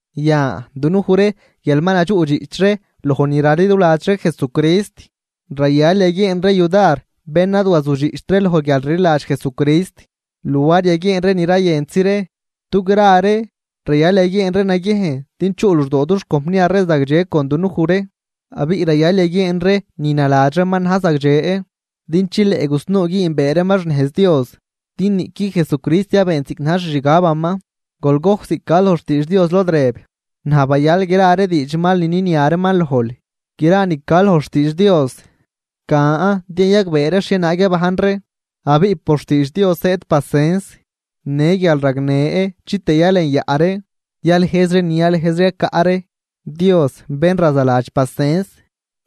Yan, dunuj ree guial ma nadxuꞌdxiꞌch ree loj ni raliduladx ree Jesucrist, rayal yaguieen ree yudar bén ad wazudxiꞌcht loj guialrliladx Jesucrist luar yaguieen ree ni rayentzi ree, dugra ree rayal yaguieen ree naguiejn din chuꞌ luxdoo dux compniar ree zagdxe con dunuj ree. Abiꞌ rayal yaguieen ree ni naladx reeman na̱j zagdxe, din chileꞌ gusnuu güünbee reeman xnejz Dios. Din niꞌqui Jesucrist ad beent ziꞌc na̱j xixgabaman, gojc ziꞌc ca loj xtiidx Dios lod rëb: “Naj bayal gra ree diidx mal ni ninia reeman lojl.” Gra ni ca loj xtiidx Dios, can din yayagbee ree xhienaag yabajn ree, abiꞌ por xtiidx Dios zëëd pacens në guialragnë chitëë yalenyaꞌ ree yalëjz ree ni ralëjz ree yacaꞌ ree. Dios, bén razaladx pacens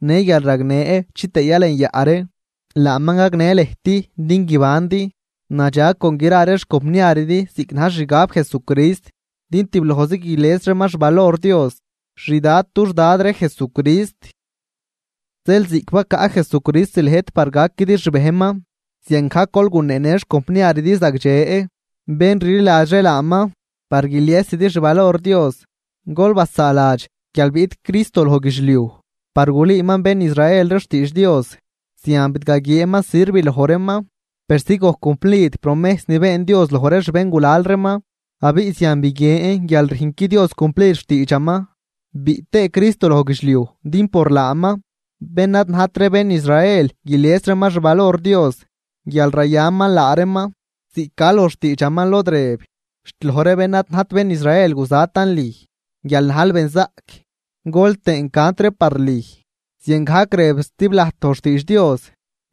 në guialragnë chitëë yalenyaꞌ ree, laaman gagnë lëjt din guibandi nadxag con gra ree xcompniaridi ziꞌc na̱j xixgab Jesucrist. Din tiblojzi guilies reeman xvalor Dios, xdad dux Dad ree Jesucrist. Zeel, ziꞌc bacaꞌ Jesucrist lëjt par gaquidi xbejnman, ziangajc gol guneenë ree xcompniaridi zagdxe, bén rliladx ree laaman par guiliesidi xvalor Dios. Gol basaaladx guial biꞌt Cristo loj guidxliuj par gulüüman bén Israel ree xtiidx Dios, zian bidgaguieenman sirv loj reeman, persi gojc cumplid promejs ni been Dios loj ree xbéngulal reeman, abiꞌ zian biguien guial rüjnqui Dios cumplid xtiidxaman. Biꞌt tëë Cristo loj guidxliuj din por laaman, bén ad najt ree bén Israel guilies reeman xvalor Dios guial rayaman laa reeman, ziꞌc ca loj xtiidxaman lod rëb: Xt loj ree bén ad najt bén Israel guzatan lüj guial najl benzaꞌc. Gol tëën cant ree par lüj. Ziangajc rëb zatiblajt loj xtiidx Dios: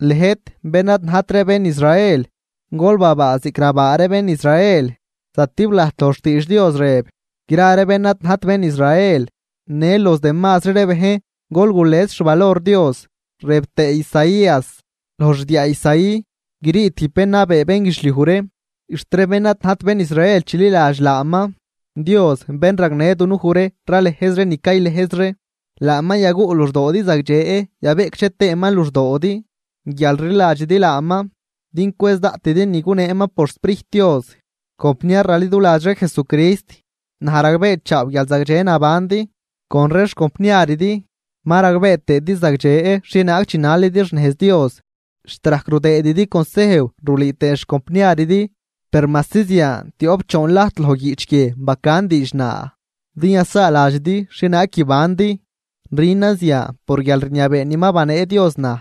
Lëjt bén ad najt ree bén Israel, gol babaa ziꞌc rabaa ree bén Israel. Zatiblajt loj xtiidx Dios rëb: Gra ree bén ad najt bén Israel. Në los demazri ree bejn, gol gules xvalor Dios. Rëb tëë Isaías: Loj xdiaa Isaí, grii tijb bén nabee bénguidxliuj ree, xt ree bén ad najt bén Israel, chililadx laaman. Dios bén ragnë dunuj ree ralëjz ree ni caylëjz ree, laaman yaguꞌ luxdoodi zagdxe yabeꞌcdxe tëëman luxdoodi guial rliladxidi laaman, din cwëz daꞌtidi ni guneeman por xSprijt Dios. Compniar raliduladx ree Jesucrist, naj ragbeechaaw guial zagdxe nabandi con ree xcompniaridi, ma ragbee tëëdi zagdxe xhienaag chinalidi xnejz Dios, xt rajc rudëëdidi consejw rulüü tëë xcompniaridi. Per majsi zian, tioꞌp choon lajt loj guiꞌch guie bacan diidx naa, din yasaaladxidi xhienaag guibandi. Rünan zian por guialrniabee ni ma banee Dios naj,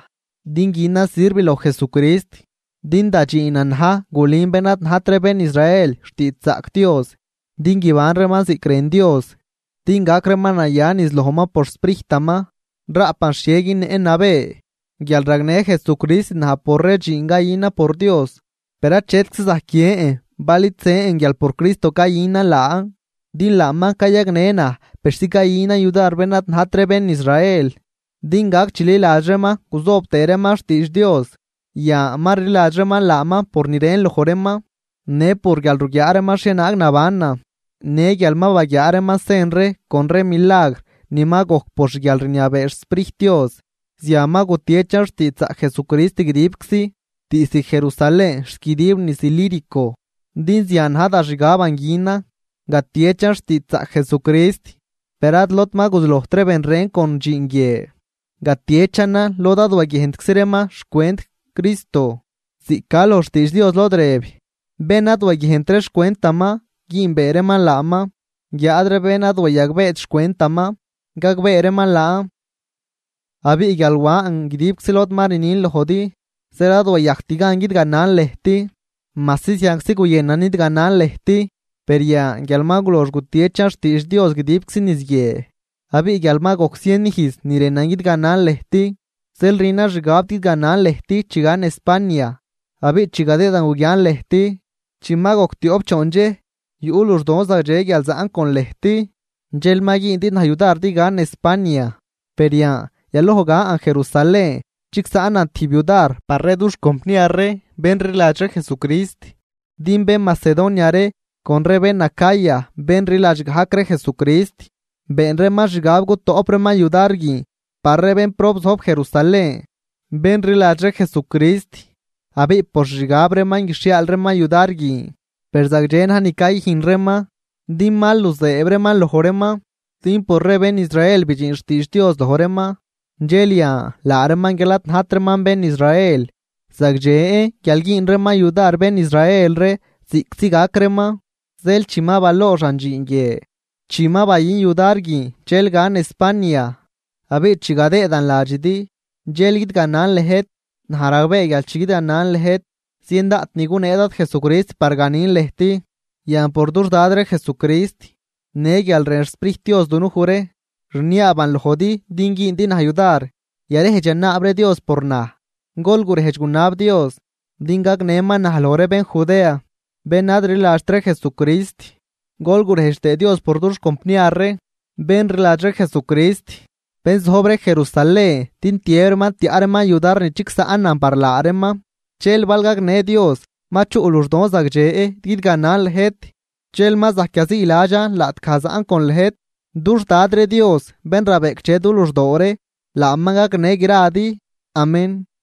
din günan sirv loj Jesucrist. Din da dxiinan na̱j gulün bén ad najt ree bén Israel xtiidxzaꞌc Dios din guiban reeman ziꞌc rën Dios, din gac reeman naya niz lojman por xSprijtaman. Raꞌpan xhie günnëꞌn nabë, guial ragnë Jesucrist naj por ree dxiin cayünan por Dios. Per achetczi zajc guiën bal id zën guial por Cristo cayünan laan, din laaman cayagnë naj persi cayünan yudar bén ad najt ree bén Israel din gac chililadx reeman guzoob tëë reeman xtiidx Dios. Yan ma rliladx reeman laaman por ni rën loj reeman në por guial ruguiaa reeman xhienaag nabanan, në guial ma baguiaa reeman sen ree con ree milagr ni ma gojc por xguialrniabee xSprijt Dios. Zian ma gutiechan xtiidxzaꞌc Jesucrist guidibczi, diizd Jerusalén xt guidib niz Ilírico. Din zian na̱j da xgaban günan, gatieꞌchan xtiidxzaꞌc Jesucrist. Per ad lod ma guzulojt ben ren con dxiin guie, gatiechanan lod ad waguiejntczi reeman xcwent Cristo, ziꞌc ca loj xtiidx Dios lod rëb: Bén ad waguiejnt ree xcwentaman, güünbee reeman laaman. Guiáad ree bén ad wayagbeet xcwentaman, gagbee reeman laan. Abiꞌ guial wan guidibczi lod ma rnin lojdi, zeel ad wayajct gan guidganan lëjt, majsi zianczi guyënan nidganan lëjt. Per yan guial ma gulox gutiechan xtiidx Dios guidib niz guie, abiꞌ guial ma gojc zien ijz ni rënan guidganan lëjt, zeel rünan xgab guidganan lëjt chi gan España. Abiꞌ chi gadëëdan guguian lëjt, chi ma gojc tioꞌp choon dxej yuꞌ luxdoon zagdxe guial zaꞌn con lëjt, dxel ma güündi naj yudar din gan España. Per yan yaloj gan Jerusalén chigsaꞌnan tijb yudar par ree dux compniar ree bén rliladx ree Jesucrist. Din bén Macedonia ree con ree bén Acaya bén rliladx gajc ree Jesucrist, been reeman xgab gutoꞌp reeman yudar guin par ree bénprob zojb ree Jerusalén, bén rliladx ree Jesucrist. Abiꞌ por xixgab reeman guixhiaal reeman yudar guin, per zagdxe na̱j ni cayüjn reeman din mal nuzëëb reeman loj reeman. Din por ree bén Israel bidxin xtiidx Dios loj reeman, dxel yan laa reeman guial ad najt reeman bén Israel, zagdxen guial güün reeman yudar bén Israel ree ziꞌctzi gac reeman. Zeel chi ma balooxan dxiin guie, chi ma bayün yudar guin, dxel gan España, abiꞌ chi gadëëdan ladxidi dxel guidganan lëjt. Naj ragbee guial chi guidganan lëjt, zien daꞌt ni gunee Dad Jesucrist par ganin lëjt. Yan por dux Dad ree Jesucrist në guial rën xSprijt Dios dunuj ree, rniaaban lojdi din güündi naj yudar yarejdx yanaab ree Dios por naj. Gol gurejdx gunab Dios din gagnëman naj loj ree bén Judea, bén ad rliladxt ree Jesucrist, gol gurejdx tëë Dios por dux compniar ree bén rliladx ree Jesucrist, bén zojb ree Jerusalén din tiëb reeman tiaꞌ reeman yudar ni chigsaꞌnan par laa reeman. Dxel bal gagnë Dios ma chuꞌ luxdon zagdxe guidganan lëjt dxel ma zajc yaziiladxan laꞌtgaj zaꞌn con lëjt. Dux Dad ree Dios bén rabeꞌcdxe du luxdoo ree, laaman gagnë gradi. Amén.